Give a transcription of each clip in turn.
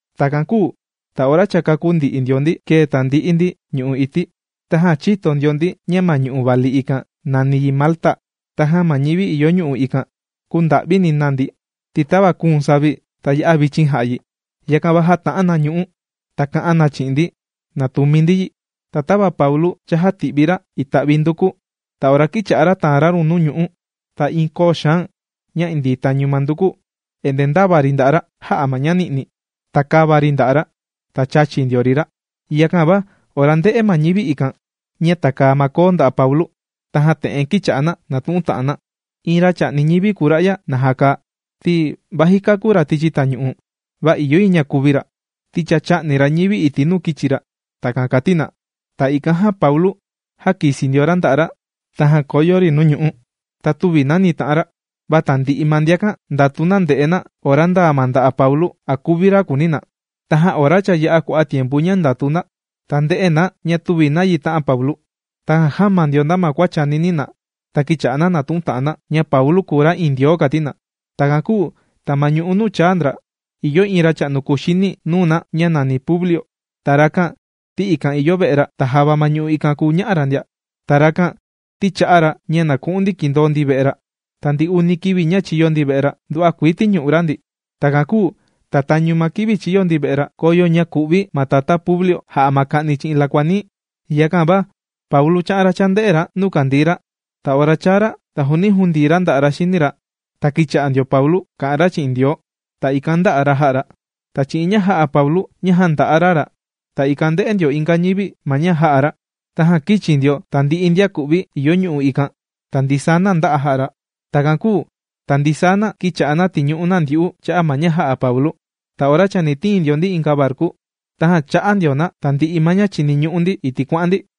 Takan kūu ta ora cha kākú ndi'i ndio ndi kēe tandi'i ndi ñu'u' ití. Tajan chīto ndio ndi ña ma ñu'u' vali ikan nàni yi Malta. Tajan ma ñivi ìyo ñu'u' ikan, kūnda'vini na ndi. Ti tava kūun savi, ta ya'a vichin jà'a yi, yakan va jāta'an na ñu'ú, ta kā'an na chi'in ndi na tùmi ndi yi. Ta tava Paulu chājati'vi ra ita'vi nduku, ta ora kīcha'a ra tàan ra run nuu ñu'ú, ta iin koo xaan ña indii tañu ma nduku endee ndāva ri nda'a' ra jā'a ma ña ni'ni. Ta kāva ri nda'a' ra, ta chāchi ndio ri ra. Yakan va ora ndē'e ma ñivi ikan ña tàkaa ma koo nda'a' Paulu, tajan te'en kīcha'a na nàtu'un ta'an na: ―Iin ra chà'ni ñivi kùu ra'ya, naja kàa. Ti vaji kāku ra tichi tañu'u, va ìyo yi ña kuvi ra, ti cha chā'ni ra ñivi iti' nuu kīchi ra. ―Takan kàti na. Ta ikan jan Paulu, jākisi ndio ra nda'a' ra, tajan kōyo ri nuu ñu'ú. Ta tüvi nani tā'an ra. Va tandi'i ma ndiakan, ndàtu na nde'e na nda ora ndaa ma nda'a' Paulu, a kuvi ra kùuni na. Tajan ora cha yā'a kua'a' tiempu ña ndàtu na, ta ndē'e na ña tüvi nayi tā'an Paulu. Tajan jāma ndio na ma kua chànini na. Ta kīcha'a na nàtu'un ta'an na, ña Paulu kùu ra iin ndioo kàti na. Takan kūu ta ma ñu'u' nuu chāa ndra, ìyo iin racha'nu kuxini nuu na, ña nàni Publio. Ta rakan ti ikan ìyo ve'e ra, ta java ma ñu'u' ikan kùu ña'a ra ndia. Ta rakan ti chā'a ra ña na ku'un ndi kindoo ndi ve'e ra. Ta ndi uni kivi ña chīyo ndi ve'e ra, nduva'a kuii tīñu'u ra ndi. Takan kūu ta tañu ma kivi chīyo ndi ve'e ra, kōyo ña kù'vi ma tatá Publio jà'a ma ka'ni chi'in lakua nií. Yakan va Paulu chā'an ra chānde'e ra nuu kàndii ra. Ta ora chāa ra, ta jūndii ra nda'a' ra xini ra. Ta kīcha'a ndio Paulu kà'an ra chi'in Ndioo, ta ikan ndā'a ra, jā'a ra. Ta chi'in ña jā'a Paulu ña jānda'a ra ra, ta ikan ndē'e ndio inga ñivi ma ña jā'a ra, tajan kīchi ndio tandi'i ndian kù'vi ìyo ñu'u' ikan, ta ndisaa na ndā'a jā'a ra. Takan kūu ta ndisaa na, kīcha'a na tìñu'u na ndyu'u cha'a' ma ña jā'a Paulu. Ta ora chani tiin ndio ndi inga varku, tajan chā'a ndio na tandi'i ma ña chìniñu'u ndi iti' kuà'an ndi.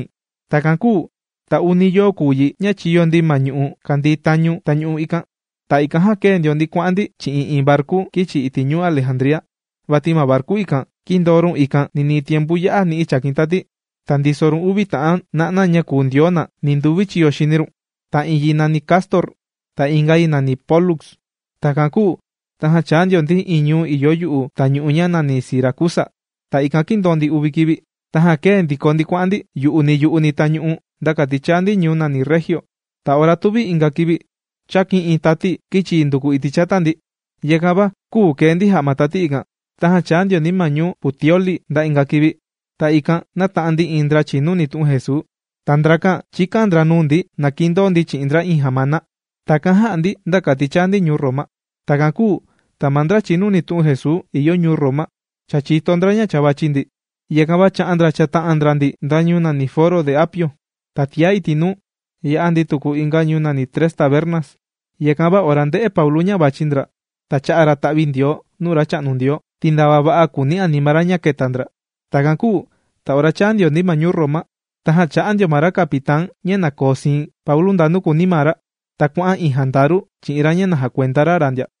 Takan kūu ta uni yoo kùu yi ña chīyo ndi ma ñu'u' kàndii tañu tañu'u ikan. Ta ikan jan kēe ndio ndi kuà'an ndi chi'in iin varku kīchi iti' ñuu Alejandría. Vati ma varku ikan, kīndoo run ikan ninii tiempu ya'a ga ni'i chàkin tati, ta ndiso run uvi ta'an na'na ña kùu ndioo na, ninduvi chiyo xini run. Ta iin yi nàni Cástor. Ta inga yi nàni Pólux. Takan kūu tajan chāa ndio ndi iin ñuu ìyo yu'u tañu'u ña nàni Siracusa. Ta ikan kīndoo ndi uni kivi, tajan kēe ndiko ndi kuà'an ndi yu'uni yu'uni tañu'u nda kati chāa ndi ñuu nàni Regio. Ta ora tuvi inga kivi, chākin iin tati kīchi yi nduku iti' chata ndi. Yakan va küu kee ndi jà'a ma tati ikan. Tajan chāa ndio ndi ma ñuu Puteoli nda inga kivi. Ta ikan nāta'an ndi iin ndra chìnuni tu'un Jesuu. Ta ndrakan chīkan ndra nuu ndi na kindoo ndi chi'in ndra iin jamana. Takan jā'a ndi nda kati chāa ndi ñuu Roma. Takan kūu ta ma ndra chìnuni tu'un Jesuu ìyo ñuu Roma, cha chìto ndra ña cha vàchi ndi. Yakan va chā'an ndra chāta'an ndra ndi nda ñuu nàni Foro de Apio. Ta tiá iti' nuu, yā'a tuku ndi inga ñuu nàni Tres Tabernas. Yakan va ora ndē'e Paulu ña vàchi ndra, ta chā'a ra ta'vindioo nuu ma Racha'nu Ndioo, ti ndava va'a kùuni anima ra ña kēta ndra. Takan kūu ta ora chāa ndio ndi ma ñuu Roma, tajan chā'a ndio ma ra capitán ña na koo siin Paulu ndanu kùuni maa ra. Ta kuà'an iin jandaru chi'in ra ña na jakuenda ra ra ndia.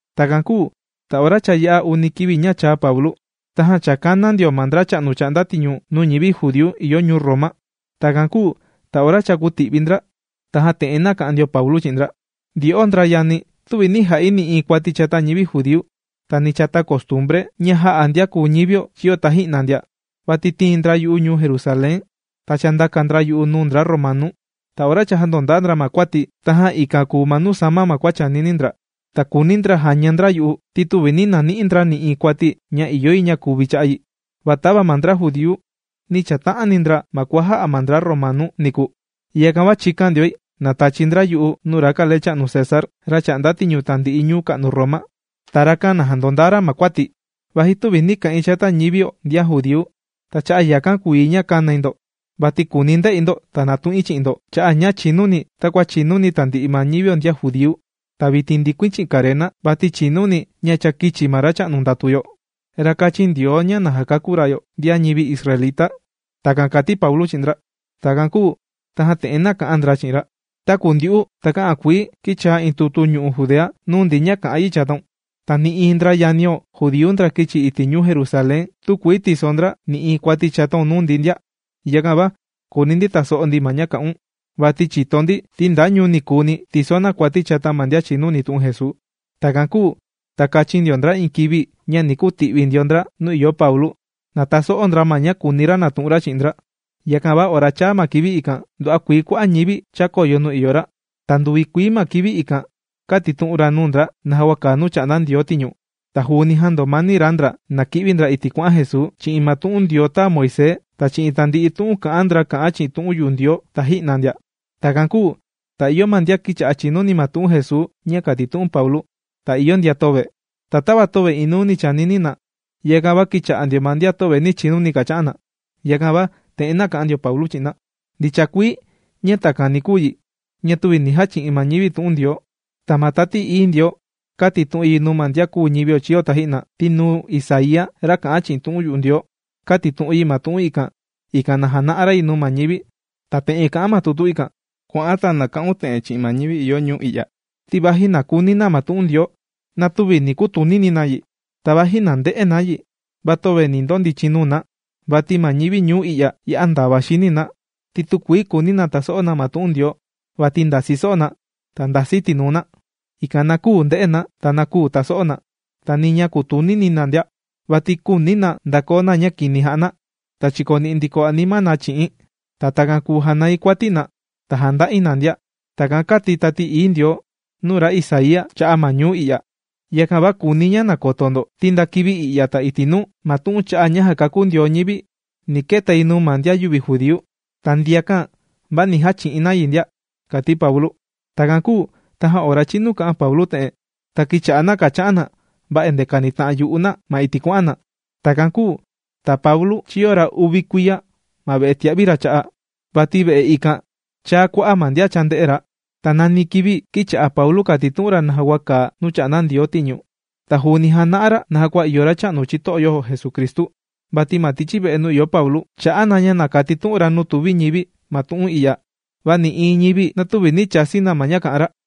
Takan kūu ta ora cha yā'a uni kivi ña chāa Paulu, tajan cha kāna ndio ra ma ndracha'nu chà'nda tiñu nuu ñivi judíu ìyo ñuu Roma. Takan kūu ta ora cha kūti'vi ndra, tajan te'en nāka'an ndio Paulu chi'in ndra: ―Ndyo'o ndra yani̱, tüvi nī ja'i nï'iin kuati̱ ni chata ñivi judíu, ta ni chata costumbre ña jā'a ndian kùu ñivio chīyo taji'na ndia. Vati tīin ndra yu'u ñuu Jerusalén. Ta chāndaka ndra yu'u nuu ndra Romanu. Ta ora cha jāndondaa ndra ma kuati̱, tajan ikan kùu ma nuu sāma kua chànini ndra, ta kùuni ndra jaña ndra yu'u ti tüvi nī nani'i ndra nï'iin kuati ña ìyo yi na kuvi̱ cha'a' yi. Va tava ma ndra judíu, nī chata'ani ndra ma kua jā'a ma ndra Romanu niku, yakan va chīkan ndioi na tachi ndra yu'u nuu ra kalecha'nu César, ra chà'nda tiñu tandi'i ñuu ka'nu Roma. Ta rakan na jandondaa ra ma kuati̱, vaji tüvi nī ka'in chata ñivio ndian judíu. Ta cha'a' yakan kùu yi ña kānai ndo, vati kùuni nde'i ndo, ta natu'in chi'in ndo cha'a' ña chìnuni̱ takua chìnuni tandi'i ma ñivio ndian judíu. Ta vitin ndikuin chi'in karena, vati chìnuni̱ ña cha kīchi ma Racha'nu ndàtu yo, ra kāchin Ndioo ña na jakakú ra yo, ndian ñivi israelita. ―Takan kàti Paulu chi'in ndra. Takan kūu tajan te'en nāka'an ndra chi'in ra: ―Taku ndyu'u takä'an kuii kīchaa iin tutu ñu'u' Judea nuu ndi ña kà'an yi chataun, ta nï'iin ndra yanio judíu ndra kīchi iti' ñuu Jerusalén tükuii tiso ndra nï'iin kuati chataun nuu ndi ndia. Yakan va kùuni ndi taso'o ndi ma ña kà'un, vati chìto ndi ti nda ñuu ni kuuni tìso na kuati chata ma ndian chìnuni tu'un Jesuu. Takan kūu ta kāchin ndra iin kivi ña ni kuti'vi ndio ndra nuu ìyo Paulu, na taso'o ndra ma ña kùuni ra natu'un ra chi'in ndra. Yakan va ora chāa ma kivi ikan, nduva'a kuii kua'a' ñivi chākoyo nuu ìyo ra. Ta nduvi kuii maa kivi ikan kātitu'un ra nuu ndra naja kua kàa nuu chà'nda Ndioo tiñu. Ta juuni jāndomani ra ndra na ki'vi ndra iti' kuà'an Jesuu, chi'in ma tu'un Ndioo tāa Moisés ta chi'in tandi'i tu'un kà'an ndra kà'an chi'in tu'un yu'u Ndioo taji'na ndia. Takan kūu ta ìyo ma ndian kīcha'a chìnuni ma tu'un Jesuu ña kàtitu'un Paulu, ta ìyo ndian töve. Ta tava töve inuuni chānini na, yakan va kīcha'a ma ndian töve nī chinuni kàcha'an na. Yakan va te'en nāka'an ndio Paulu chi'in na: ―Ndicha kuii ña takan ni kuu ña tüvi nī jachi'in ñivi tu'un Ndioo. Ta ma Tati Ií Ndioo kātitu'un yi nuu ndian kùu ñivio chīyo taji'na. Ti nuu Isaía ra kà'an chi'in tu'un yu'u Ndioo, kātitu'un yi ma tu'un ikan, ikan na jana'a ra yi nuu ma ñivi. Ta te'en kà'an ma tu'un ikan: Kua'an ta na ka'un te'en chi'in ma ñivi ìyo ñuu i'ya: Ti vaji na kuni na ma tu'un Ndioo, va tüvi ni kutunini na yi. Ta vaji na nde'e na yi, va töve ni ndondichin nuu na. Vati ma ñivi ñuu i'ya, ya'a ndava xini na, ti tükuii kùuni na taso'o na tu'un Ndioo. Vati ndasi so'o na. Ta ndasi tinuu na, ikan na küu nde'e na ta küu taso'o na, ta ni ña kutunini na ndia. Vati küuni na ndakoo na ña kini jà'a na, ta chikoni'i ndiko anima na chi'i̱n, ta takan kùu janai kuati na, ta janda'i na ndia. Takan kāti Tati Ií Ndioo nuu ra Isaía cha'a' ma ñuu i'ya. Yakan va kùuni̱ ña na koto ndo, ti nda kivi i'ya ta iti' nuu, ma tu'un cha'a' ña jàkakú Ndioo ñivi ni keta yi nuu ma ndian yüvi judíu. Ta ndiakan va ni jachi'in na yi ndia ―kàti Paulu. Takan kūu tajan ora chīnu kā'an Paulu te'en, ta kīcha'a na kàcha'an na va endee kànita'an yu'u na ma iti' kuà'an na. Takan kūu ta Paulu chīyo ra uvi kuiya ma ve'e tìa'vi ra cha'a'. Vati ve'e ikan chāa kua'a' ma ndian chānde'e ra. Ta nani kivi kīcha'a Paulu kàtitu'un ra naja kua kàa nuu chà'nda Ndioo tiñu. Ta juuni jàna'a ra naja kua ìyo Racha'nu chito'o yo Jesucristu. Vati ma tichi ve'e nuu ìyo Paulu, chà'a na ña kàtitu'un ra ma nuu tùvi ñivi ma tu'un i'ya, va nï'iin ñivi na tüvi nī chasi na ma ña kà'an ra.